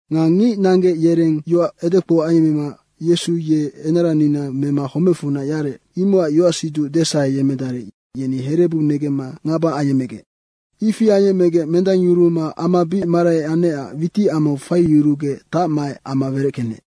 Nga ngic nanggec yereng yoac edekpou ayemmema Yesu ye enaranina mema homecfunac yarec, imocac yoacsiduc desaheyemmedarec yeni herebu negemma ngaba ayecmegec. Ifi ayecmema mendangyuruma ama bic marai anecac witicamau faiyurugec tacmaec ama wereckenec.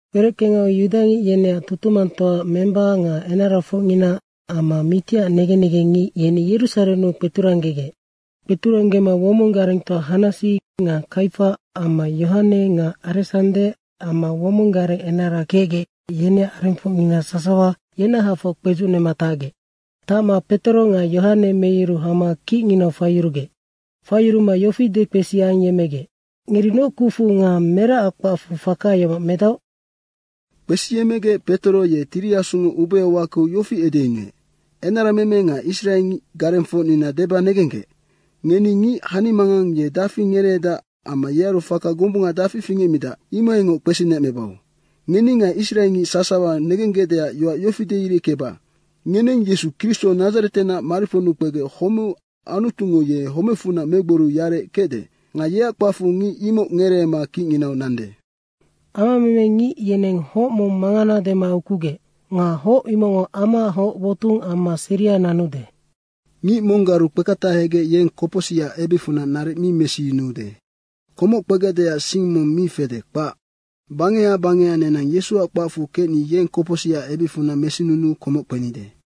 Wereckengau yudangic yeneac tutumangtoaac memba nga enarafocngina amma mitiac negen negengngic, yeni Yerusarennu kpeturanggegec. Kpeturanggema womong garengtoa Hanasi nga Kaifa amma Yohane nga Aresande amma womong gareng enara kecdae, yeneac arengfocngina sasawa yenahafoc kpedzucnema tacgec. Tacma Petoro nga Yohane meyuru hama kicnginau faiyurugec. Faiyuruma yofi dekpesi ayecmegec, “Ngeri noc kucfu nga meracac kpacfu faka yomoc medaoc?” Kpesiyecmegec Petoro ye Tiri Asungo ubeau wakeu yofi edeyunuec, “Enarameme nga Israe garengfocnina deba negenggec. Ngeni ngic hanimangang ye dafi ngereedac amma yearu faka gombunga dafi fingecmidac, imohaingoc kpesinecmebau. Ngeni nga israengic sasawa negenggecdeac yoac yofi deireckeba, ngeneng Yesu Kristo Nadzaretenac mariponnu kpegec homeu Anutungo ye homecfunac megboriu yarec kecde. Nga yeac kpacfu ngic imoc ngereema kicnginau nande. ‘Amameme ngic yeneng hoc mong mangana dema ukugec. Nga hoc imocngo amaac hoc wotung amma seria nanude.’ Ngic monggaru kpeketahegec yeng kopocsicac ebicfunac naric mi mesiyunuude, komoc kpegecdeac sing mong mi fede, kpac. Bangeha bangeha nenang Yesuac kpacfu kecni yeng kopocsicac ebicfunac mesinunuu komoc kpenide.”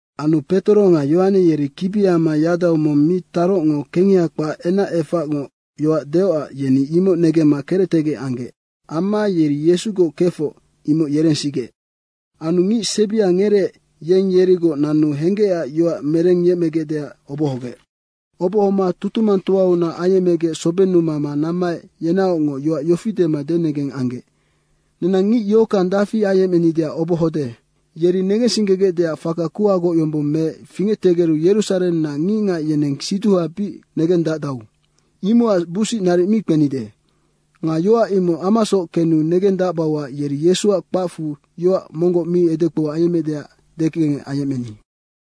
Anu Petoro nga Yohane yeri kibiama yadau mong mi tarocngo kengeha kpac enacefacngoc yoac deocac yeni imoc negemma kerectegec anggec. Amma yeri Yesugoc kefoc, imoc yerensigec. Anu ngic sebia ngereec, yeng yerigoc nanu henggecac yoac merengyecmegecdeac obohogec. Obohoma tutumangtoaunac ayecmegec sobennu mama nammaec yenaocngoc yoac yofi dema denegeng anggec. “Nenang ngic yohockang dafi ayecmenideac obohode. Yeri negensinggegecdeac faka kuhagoc yombong meec fingectegeru Yerusarennac ngicngac yeneng siduha bic negendacdau, imocac busic naric mi kpenide. Nga yoac imoc amasoc kenu negendacbauac yeri Yesuac kpacfu yoac monggoc mi edekpou ayemmeecdeac dekengec ayecmeni.”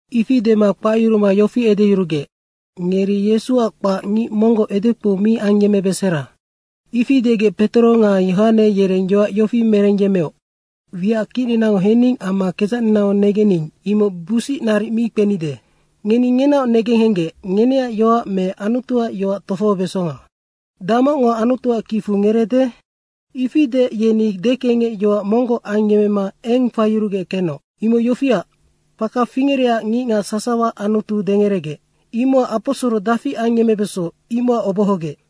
Ifi dema kpacyuruma yofi edeyurugec, “Ngeri Yesuac kpac ngic monggoc edekpou mi ayemmebesera.” Ifi degec Petoro nga Yohane yereng yoac yofi merengyemmeoc, “Wiac kicninango hening amma kedzacninango negening, imoc busic naric mi kpenide. Ngeni ngenaoc negenghenggec, ngeneac yoac me Anutuac yoac tofohobesonga. Damocngo Anutuac kicfu ngereede?” Ifi deec yeni dekengec yoac monggoc ayecmema eng faiyurugec kenoc. Imoc yofiac, faka fingerecac ngicngac sasawa Anutu dengeregec. Imocac aposoro dafi ayemmebeso, imocac obohogec.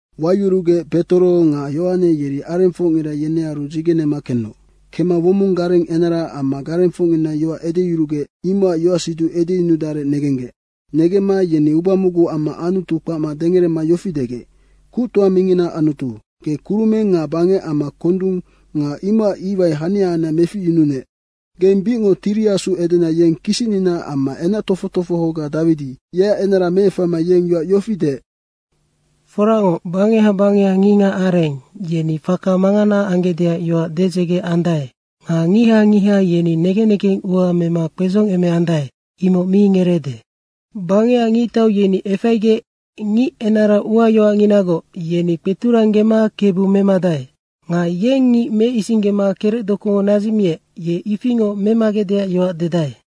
Wayurugec Petoro nga Yohane yeri arengfocngira yenearu dzigenema kenoc. Kemma womong gareng enara amma garengfocngina yoac edeyurugec, imocac yoacsiduc edeyunudarec negenggec. Negemma yeni uba mocgu amma Anutu kpacma dengerema yofi degec, “Kuctoa mingina Anutu, ge kurumeng nga bangec amma kondung nga imocac iwai hania hania meficyununec. Geng bicngoc Tiri Asu edena yeng kisicnina amma enac tofoc tofohoga Dawidi, yeac enara meefaina yeng yoac yofi deec, ‘Foracngoc bangeha bangeha ngicngac areng, yeni faka mangana anggecdeac yoac dedzege andae nga ngiha ngiha yeni negen negeng ua mema kpedzongemeandae, imoc mi ngereede. Bangecac ngictau yeni efaigec ngic enara uayoacnginagoc, yeni kpeturanggema KEBU memadae. Nga yeng ngic meisinggema kerecdokungo nadzicmiec, ye ifingoc memagecdeac yoac dedae.’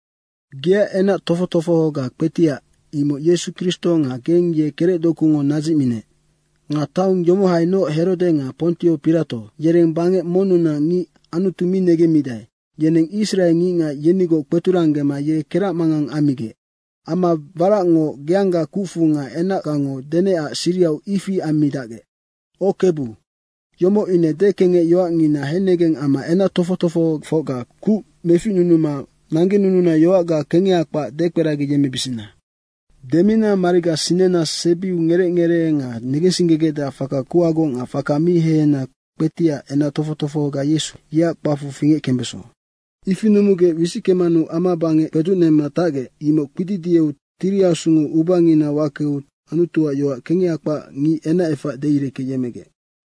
Geac enac tofoc tofohoga kpetiac, imoc Yesu Kristo nga geng ye kerecdokungo nadzicminec. Nga taong yomohainoc Herode nga Pontio Pirato, yereng bangec monnunac ngic Anutu mi negemmidae, yeneng israe ngicngac yenigoc kpeturanggema ye keracmangang ammigec. Amma waracngoc geangga kucfu nga enacgango denecac sirihau ifi ammidacgec. O Kebu, yomoc ine dekengec yoacngina hennegeng amma enac tofoc tofohofocga kuc meficnunuma nanggenununa yoacga kengeha kpac dekperagiyemmebisina. Demina mariga sinena sebiu ngerec ngeree nga negensinggegecdeac faka kuhagoc nga faka mi hehena kpetiac enac tofoc tofohoga Yesu, yeac kpacfu fingeckembeso.” Ifi numugec wisickemanu amabangec kpedzucnema tacgec, imoc kpididieu Tiri Asungo ubanginau wakeu Anutuac yoac kengeha kpac ngic enacefac deireckeyemmegec.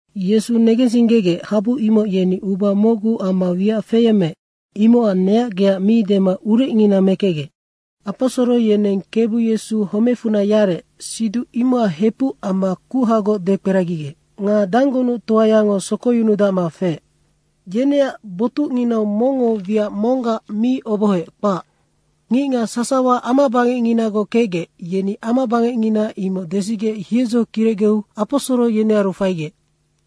Yesu negensinggegec, habu imoc yeni uba mocgu amma wiac feyemmeec, imocac neac geac mi dema urecngina mekecgec. Aposoro yeneng Kebu Yesu homecfunac yarec, siduc imocac hepuc amma kuhagoc dekperagigec. Nga danggunuctoayango sokoyunudacma feec. Yeneac botucnginau mongngo wiac monggac mi obohoec, kpac. Ngicngac sasawa amabangecnginagoc kecgec, yeni amabangecngina imoc desigec hiedzo kirecgeu Aposoro yenearu faigec.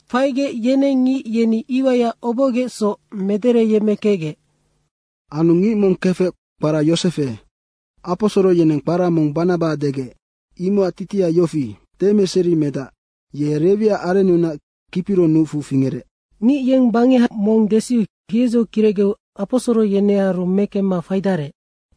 Faigec, yeneng ngic yeni iwaiac obohogecsoc medereyemmekecgec. Anu ngic mong kefec kpara Yosefe, aposoro yeneng kpara mong Banaba degec, imocac titiha yofi: Demeseri medac. Ye Rewiac arennunac Kipiro nucfu fingerec. Ngic yeng bangeha mong desiu hiedzo kirecgeu aposoro yenearu mekemma faidarec.